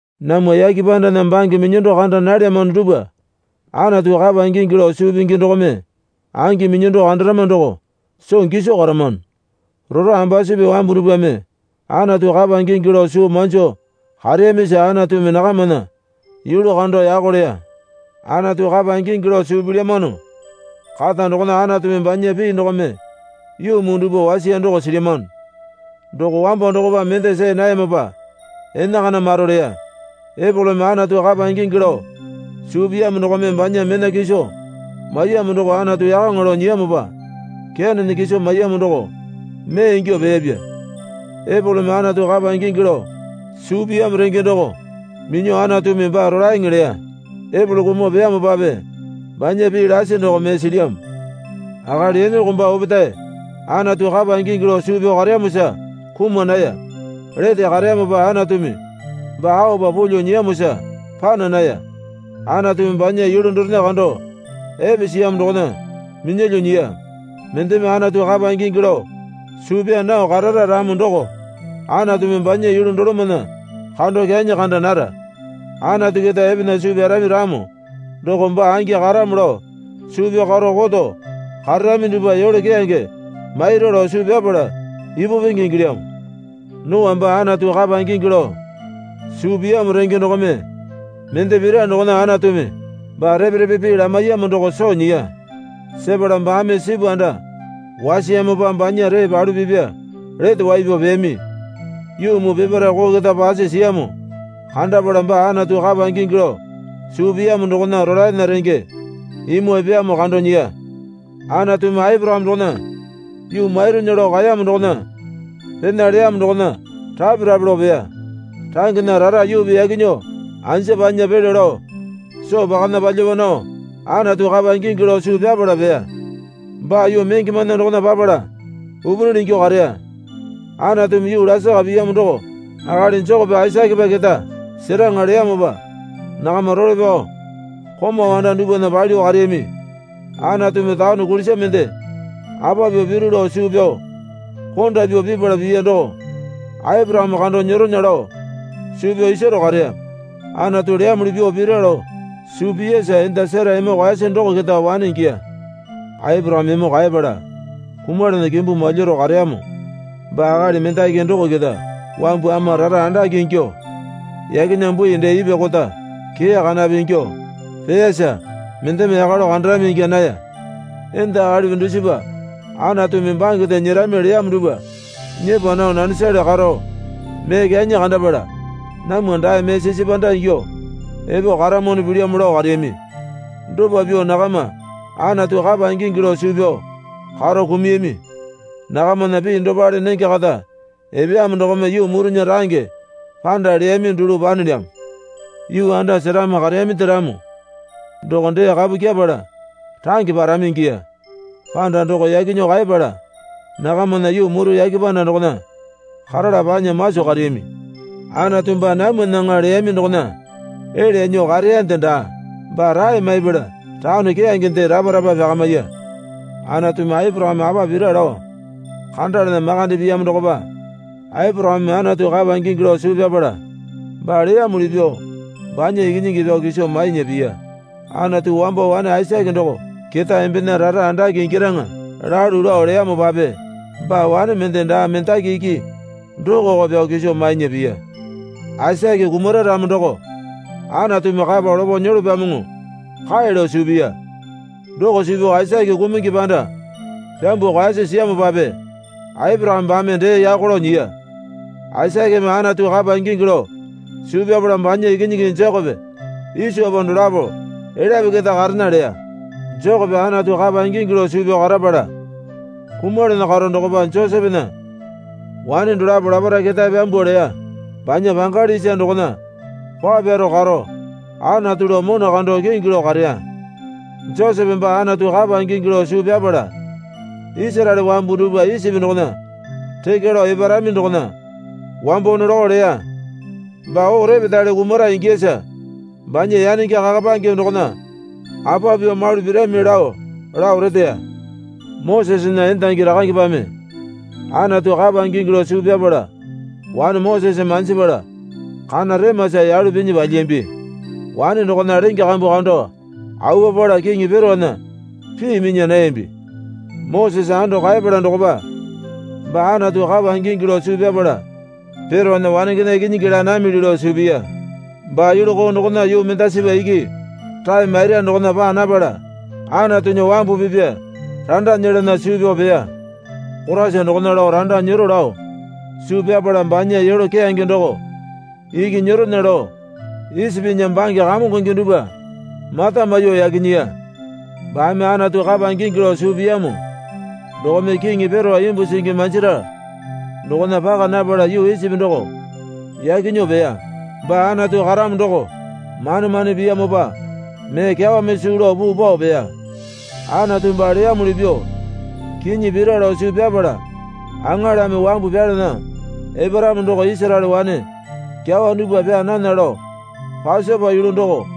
Namwa yake pandana bange minyando kanda nalyamano dupwa Anatu kapa ingingi lao suu pingi dokome angi minyando kandarama doko soo giso karamano. Rora ambusupi wambu dupwame Anatu kapa ingingi lao soo manjo kareyamisa Anatumi nakamana yulu kando yako leya. Anatu kapa ingingi lao suu pilyamano kata dokona Anatumi banya pii dokome yuu muu dupwa wasiya doko silyamano. Doko wambo dokopa mende see nayamopa enakana maro leya. Epolome Anatu kapa ingingi lao suu piyamo dokome banya mena kiso maiyamo doko Anatu yakaŋa lao nyiyamopa Kenena kiso maiyamo doko mee ingyuo peyapya. Epolome Anatu kapa ingingi lao suu piyamo renge doko minyuo Anatumi baa rolaeŋe leya. Epolo kumuo peyamopape banya pii lasi doko mee silyamo. Akali Inoko baa opetae Anatu kapa ingingi lao suu pyao kareyamosa kuma naya. Lete kareyamopa Anatumi baa aopa pulyuo nyiyamosa pana naya. Anatumi banya yulu dorena kando epe siyamo dokona minyalyuo nyiya. Mendeme Anatu kapa ingingi lao suu pyaa nao karara ramo doko Anatumi banya yulu dolomana kando kyanyi kanda nara. Anatu keta epana suu pyarami ramo doko baa angi karamo lao suu pyao karo koto kararami dupwa yole keyange maira lao suu pyapala ipu penge ingilyamo. Noa baa Anatu kapa ingingi lao suu piyamo renge dokome mende pira dokona Anatumi baa repe repe pii lamaiyamo doko soo nyiya. Sepala baame sipu anda wasiyamopa banya ree palu pipa lete wai pyao peyami. Yuu muu peparae koo keta pasi siyamo kandapala baa Anatu kapa ingingi lao suu piyamo dokona rolaena renge imu epeyamo kando nyiya. Anatumi Aporakame dokona yuu maironya lao kaeyamo dokona pena leyamo dokona rape rape lao peya. Rangena rara yuupi yaki nyuo anja panya pelyo lao soo pakana palyapa nao Anatu kapa ingingi lao suu pyapala peya. Baa yuu mengemana dokona papala upunili ingyuo kareya. Anatumi yuu lasaka piyamo doko akali Jekope Aisakepa keta seraŋa leyamopa nakama role pyao komau anda dupwana palyuo kareyami. Anatumi taone kulisa mende apa pyuo piru lao suu pyao konda pyuo pipala piya doko Aporakame kando nyeronya lao suu pyao isaro kareya. Anatu leyamuli pyuo pira lao suu piyasa enda Sera emo kaeyasi doko keta wane ingiya. Aporakame emo kaepala kumalana kimbu malyaro kareyamo baa akali mendaki doko keta wambu ama rara andake ingyuo yakena bui dee ipwa kota kee kanape ingyuo peeyara mendeme yaka lao kandarami ingya naya. Enda akalipi dusipa Anatumi bangende nyerami leyamo dupwa nyepa nao nanesale karo mee kyanyi kandapala, Namwa dae mee sisi panda ingyuo epo karamwano pilyamo lao kareyami. Dopa pyuo nakama Anatu kapa ingingi lao suu pyao karo kumuyami. Nakamana pii dopale nenge kata epeyamo dokome yuu murunya range panda leyami dulu panelyamo. Yuu anda seramo kareyaminde ramo doko dee kapu kyepala range parami ingiya. Panda doko yaki nyuo kaeyapala nakamana yuu muru yake panda dokona karala panya maso kareyami. Anatu baa namwanaŋa leyami dokona elya nyuo kareyande daa. Baa rae maipala taone keyangende rapa rapa pyakamiya. Anatumi Aporakame apa pira lao kandalana makande piyamo dokopa Aporakame Anatu kapa ingingi lao suu pyapala baa leyamuli pyuo banya ikinyingi pyao kiso mainya piya. Anatu wambo wane Aisake doko keta embena rara andake ingyaraŋa lalu lao leyamopape baa wane mende daa mendaki iki dokoko pyao kiso mainya piya. Aisake kumara ramo doko Anatumi kapa lopo nyolopyamoŋo kae lao suu piya. Doko suu pyao Aisake kumungi panda pyambuo kaeyasi siyamopape Aporakame baame dee yako lao nyiya. Aisakeme Anatu kapa ingingi lao suu pyapala banya ikinyingi Jekope Isopa dolapo elyape keta karena leya. Jekope Anatu kapa ingingi lao suu pyao karapala kumalana karo dokopa Josepena wane dolapo laparae ketae pyambuo leya. Banya pangali isa dokona paa pyaro karo Anatu lao mona kando kingi lao kareya. Josepe baa Anatu kapa ingingi lao suu pyapala Isaraele wambu dupwa Isipi dokona rekya lao eparami dokona wambo nolokao leya. Baa oo repetale kumara ingiyasa banya yanenge kakapange dokona apa pyuo malu pirami lao lao reteya. Mosesena endangi rakangepame Anatu kapa ingingi lao suu pyapala wane Mosese manjipala kana remasa yalu pinyi palyiyambi. Wane dokona lenge kambu kando awuapala Kiŋi Peraona pii minya nayambi. Mosese ando kaeyapala dokopa baa Anatu kapa ingingi lao suu pyapala Peraona wanengena ikinyingi laa namili lao suu piya. Baa yulu koo dokona yuu mendasipa iki rae maira dokona paa napala Anatunya wambu pipa randa nyelana suu pyao peya. Koraisa dokona lao randa nyero lao suu pyapala banya yole keyange doko iki nyeronya lao Isipinya bange kamongonge dupwa mata maiyuo yaki nyiya. Baame Anatu kapa ingingi lao suu piyamo dokome Kiŋi Perao imbu singi manjira dokona paka napala yuu Isipi doko yaki nyuo peya. Baa Anatu karamo doko mane mane piyamopa mee kyawame suu lao puu pao peya. Anatu baa leyamuli pyuo kinyi pira lao suu pyapala aŋalame wambu pyalana eparamo doko Isaraele wane kyawa dupwa pyaa nana lao Pasopa yulu doko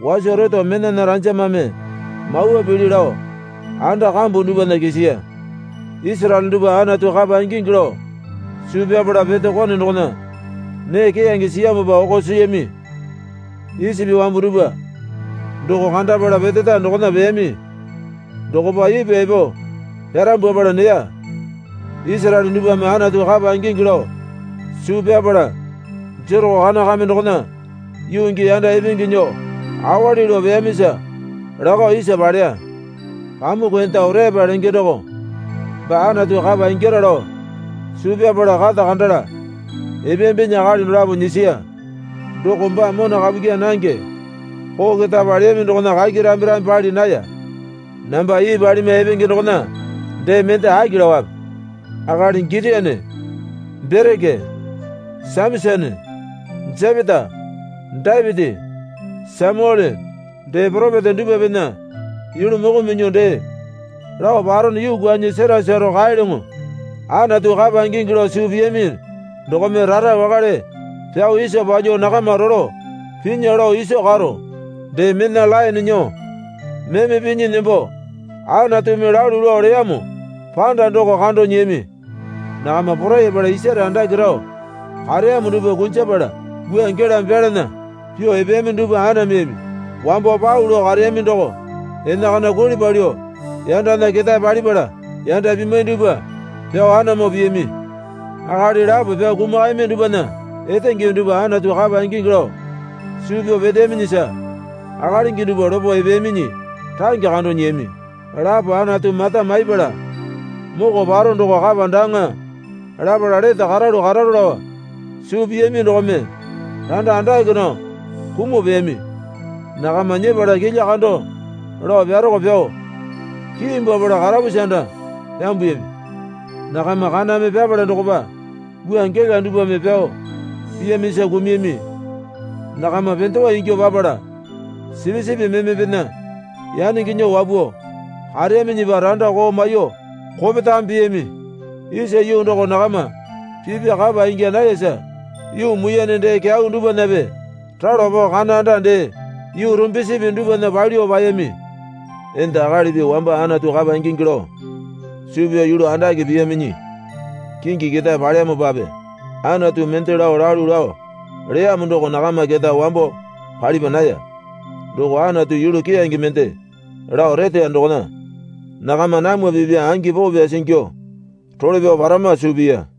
waso reto menana ranjamame mawa pili lao anda kambu dupwana kisiya. Isaraele dupwa Anatu kapa ingingi lao suu pyapala pete kone dokona nee keyange siyamopa oko siyami. Isipi wambu dupwa doko kandapala peteta dokona peyami dokopa ipwa epo pyarambwapala neya. Isaraele dupwame Anatu kapa ingingi lao suu pyapala Jereko kame kana dokona yuu gii yanda ipingi nyuo awali lao peyamisa lakao isa paleya. Pamuku enda Oreapa lenge doko baa Anatu kapa ingyara lao suu pyapala kata kandala epeyambinyi akali dolapo nyisiya. Doko baa mona kapu kyaa nange koo keta paleyami dokona kaki rambe rambe pali naya. Namba ii palimwa epenge dokona dee mende aki laowape? Akali Gitione, Bereke, Samasone, Jepeta, Dapiti, Samyuele dee poropeta dupwapena yulu moko minyuo dee lao parono yuu kwuanyi sera saro kaelyoŋo. Anatu kapa ingingi lao suu piyami dokome rara wakale pyao isa palyuo nakama rolo pinya lao iso karo, dee mena laene nyuo meme pinyi nembo Anatumi lalu lao leyamo panda doko kando nyiyami. Nakama porayapala isare andake rao kareyamo dupwa kunjapala wua gelame pyalana pyuo epeyami dupwa anameyami. Wambo pau lao kareyami doko enakana kuli palyuo yandana ketae palipala yanda pimwai dupwa pyao anamo piyami. Akali lapo pyao kumakayami dupwana etenge dupwa Anatu kapa ingingi lao suu pyao peteyaminyisa akalingi dupwa lopo epeyaminyi range kando nyiyami. Lapo Anatu mata maiyapala moko paro doko kapa daaŋa lapala lete karalu kararo lao suu piyami dokome randa andake nao kumuo peyami. Nakama nyepala kilya kando lao pyarako pyao kiimbwapala karapusi anda pyambuyami. Nakama kaname pyapala dokopa wua gela dupwame pyao piyamisa kumuyami. Nakama pendewa ingyuo papala sipisipi memepena yanenge nyuo wapuo kareyaminyipa randa koo maiyuo kopetame piyami. Isa yuu doko nakama pipa kapa ingya nayasa yuu muiyane dee kyau dupwanape ralo pao kana anda dee yuu rumbisipi dupwana palyuo paeyami. Enda akalipi wamba Anatu kapa ingingi lao suu pyao yulu andake piyaminyi kingi ketae paleyamopape Anatu mende lao lalu lao leyamo doko nakama keta wambo palipa naya. Doko Anatu yulu keyange mende lao reteya dokona nakama namwa pipya angi poo pyasi ingyuo role pyao parama suu piya.